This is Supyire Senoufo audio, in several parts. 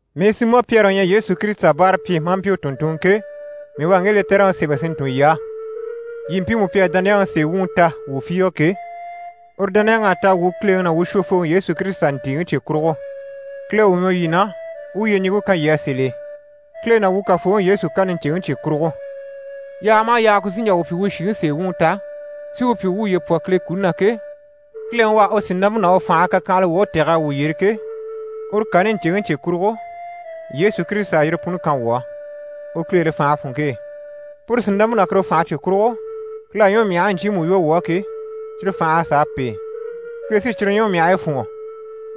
Mii Simɔ Pyɛri u ɲyɛ Yesu Kirisita báarapyi maa mpyi u tùnntunŋɔ ke, mii u à ŋge lɛtɛrɛŋi sémɛ si ntun yii á, yii mpii pi à dániyaŋi sèe wuŋi ta wuu fiige ke, uru dániyaŋ'à ta wuu Kileŋi ná wuu Shwofooŋi Yesu Kirisita ntìiŋi cye kurugo. Kile u ɲwɔ yii na, u u yyeɲiŋke kan yii á sèl'e, Kile ná wuu Kafooŋi Yesu kani ɲcèŋi cye kurugo. Yaaga maha yaaga ku sí n‑jà wuu pyi wuu shìŋi sèe wuŋi ta, si wuu pyi wuu wuye pwɔ Kile na ke, Kileŋi u à u sìnampe ná u fànhe kakyanhala woge tɛ̀g'a wuu yyere ke, uru kani ɲcèŋi cye kurugo Yesu Kirisita à yire puni kan wuu á, u kileere fànhe funŋke e. Puru sìnampe ná kuru fànhe cye kurugo, Kile à ɲwɔmyahigii ɲcyiimu lwɔ́ wuu á ke, cyire fành'à sàa pêe, Kile sí cyire ɲwɔmyahigii fûnŋɔ,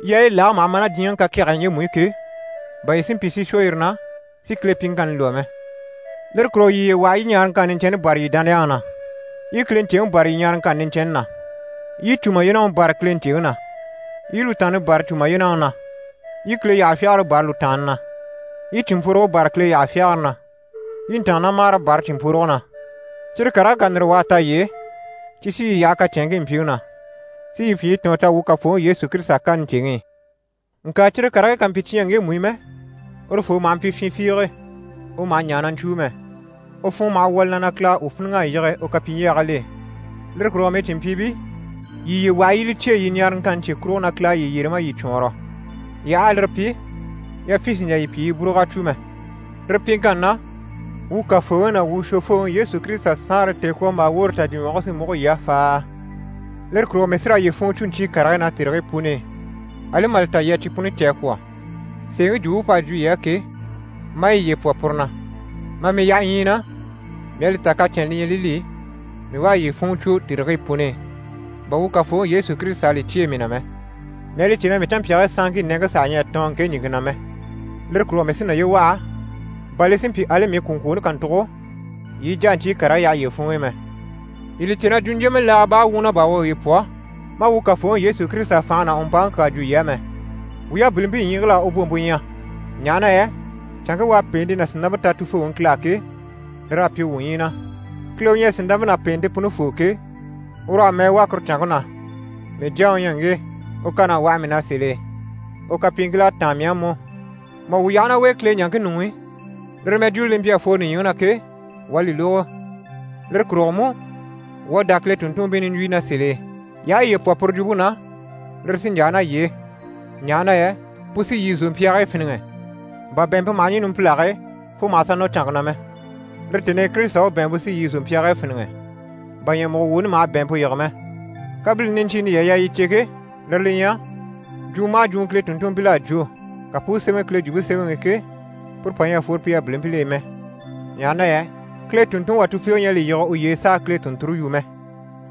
yaayi lage maha ma ná diɲyɛŋi kakɛgɛyi ɲjemu i ke, bà yii si mpyi si shwɔ yire na, si Kile pyiŋkanni lwɔ́ mɛ. Lire kurugo yii yiye waha yii i ɲaaraŋkanni niɲcɛnni bâra yii dániyaŋi na, yii i Kile ɲcèŋi bâra yii ɲaaraŋkanni niɲcɛnni na, yii i cùmayenaŋi bâra Kile ɲcèŋi na, yii i lùtaanni bâra cùmayenaŋi na, yii i Kile yyaha fyagare bâra lùtaanni na, yii i cìnmpworoge bâra Kile yyaha fyagare na, yii i ntàannamagare bâra cìnmpworoge na. Cyire karigii ká ndire wà a ta yii e, cyi sí yii yaha kacɛnŋkii mpyiŋi na, si yii pyi yii tɔ̀ɔn ta wuu Kafooŋi Yesu Kirisita kani ɲcèŋi i. Ŋka cyire karigii ká mpyi cyi ɲyɛ ŋgemu i mɛ, urufoo maha mpyi fyin fiige, u maha ɲaa na ɲcwúu mɛ. U funŋɔ maha wwɔ̀ li na na Kile à u fíniŋ'a yige u kapyiɲjyagil'e. Lire kurugo mii cìnmpyiibii, yii yiye waha yii i li cyêe yii ɲaaraŋkanni cye kurugo na Kile à yii yyere maa yii cwɔɔnrɔ. Yii aha a lire pyi, yafyin sì n‑jà yii pyi yii búrug'a cwo mɛ. Lire pyiŋkanni na, wuu Kafooŋi ná wuu Shwofooŋi Yesu Kirisita Saanre tèekwombaa woore tajyiɲwɔge sí múgo yii á faaa. Lire kurugo mii sí raa yii funŋɔ cwo ɲcyii karigii na tèrigii puni i, ali mà li ta yii à cyi puni cè a kwɔ̀, sèeŋi jwumpe p'à jwo yii á ke, maa yiye pwɔ puru na. Mà mii yaha ɲyii na, mii à li ta kacɛnnɛ li ɲyɛ li li, mii u a yii funŋɔ cwo tèrigii puni i. Bà wuu Kafooŋi Yesu Kirisita à li cyêe mii na mɛ, mii à li cè na mii canmpyaagii sanŋkii nɛŋke saha ɲyɛ a tɔɔn ŋke ɲìŋke na mɛ. Lire kurugo mii sí naye waha, bà li si mpyi ali mii kwùŋkwooni kàntugo yii i jà a ɲcyii karigii yaha yiye funŋ'i mɛ. Yii li cè na jwuɲjyemɛ laaga baa wumɔ na bà wuu à wuye pwɔ maa wuu Kafooŋi Yesu Kirisita fànhe ná u mpaŋi kyaa jwo yii á mɛ. Wuu yabilimpii ɲyiigil'à u bwompe ɲya, ɲaha na yɛ canŋke u à pèente ná sìnampe ta Tufooŋi Kile á ke, lir'à pyi wuu ɲyii na. Kile u ɲyɛ sìnampe ná pèente punifoo ke, ur'à mɛɛ wà kuru canŋke na: «Mii Jyaŋi u ɲyɛ u ŋge, u kan'à waha mii na sèl'e, u kapyiiŋkil'à táan mii á mú.» Mà wuu yaha ná u e Kile ɲaŋke ɲuŋ'i, lire mɛjwuuni li mpyi a fworo nìɲyiŋi na ke, wuu à li lógo. Lire kurugo mú, wuu à dá Kile tùnntunmpii nìɲjwuyi na sèl'e. Yii aha yiye pwɔ puru jwumpe na, lire sí n‑yaa ná yii e, ɲaha na yɛ pu sí yii zòmpyaagii fíniŋɛ, bà bɛ̀ɛnmpe maha ɲî numpilage e fo mà sà nɔ canŋke na mɛ. Lire tèni i Kirisita u bɛ̀ɛnmpe sí yii zòmpyaagii fíniŋɛ, bà ɲyɛ̀mugo woni maha bɛ̀ɛnmpe yige mɛ. Kabilini niɲcyiini yii à yaa yii cè ke, lire li ɲyɛ: jwumɔ maha jwumɔ Kile tùnntunmpil'à jwo, ka pu u sémɛ Kile Jwumpe Semɛŋi i ke, puru pà ɲyɛ a fworo pi yabilimpil'e mɛ, ɲaha na yɛ Kile tùnntunŋi wà tufiige ɲyɛ a li yige uye e s'a Kile tùnnture yu mɛ,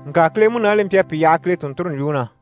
ŋka Kile Munaani li mpyi a pi yaha Kile tùnnture ɲjwuŋi na.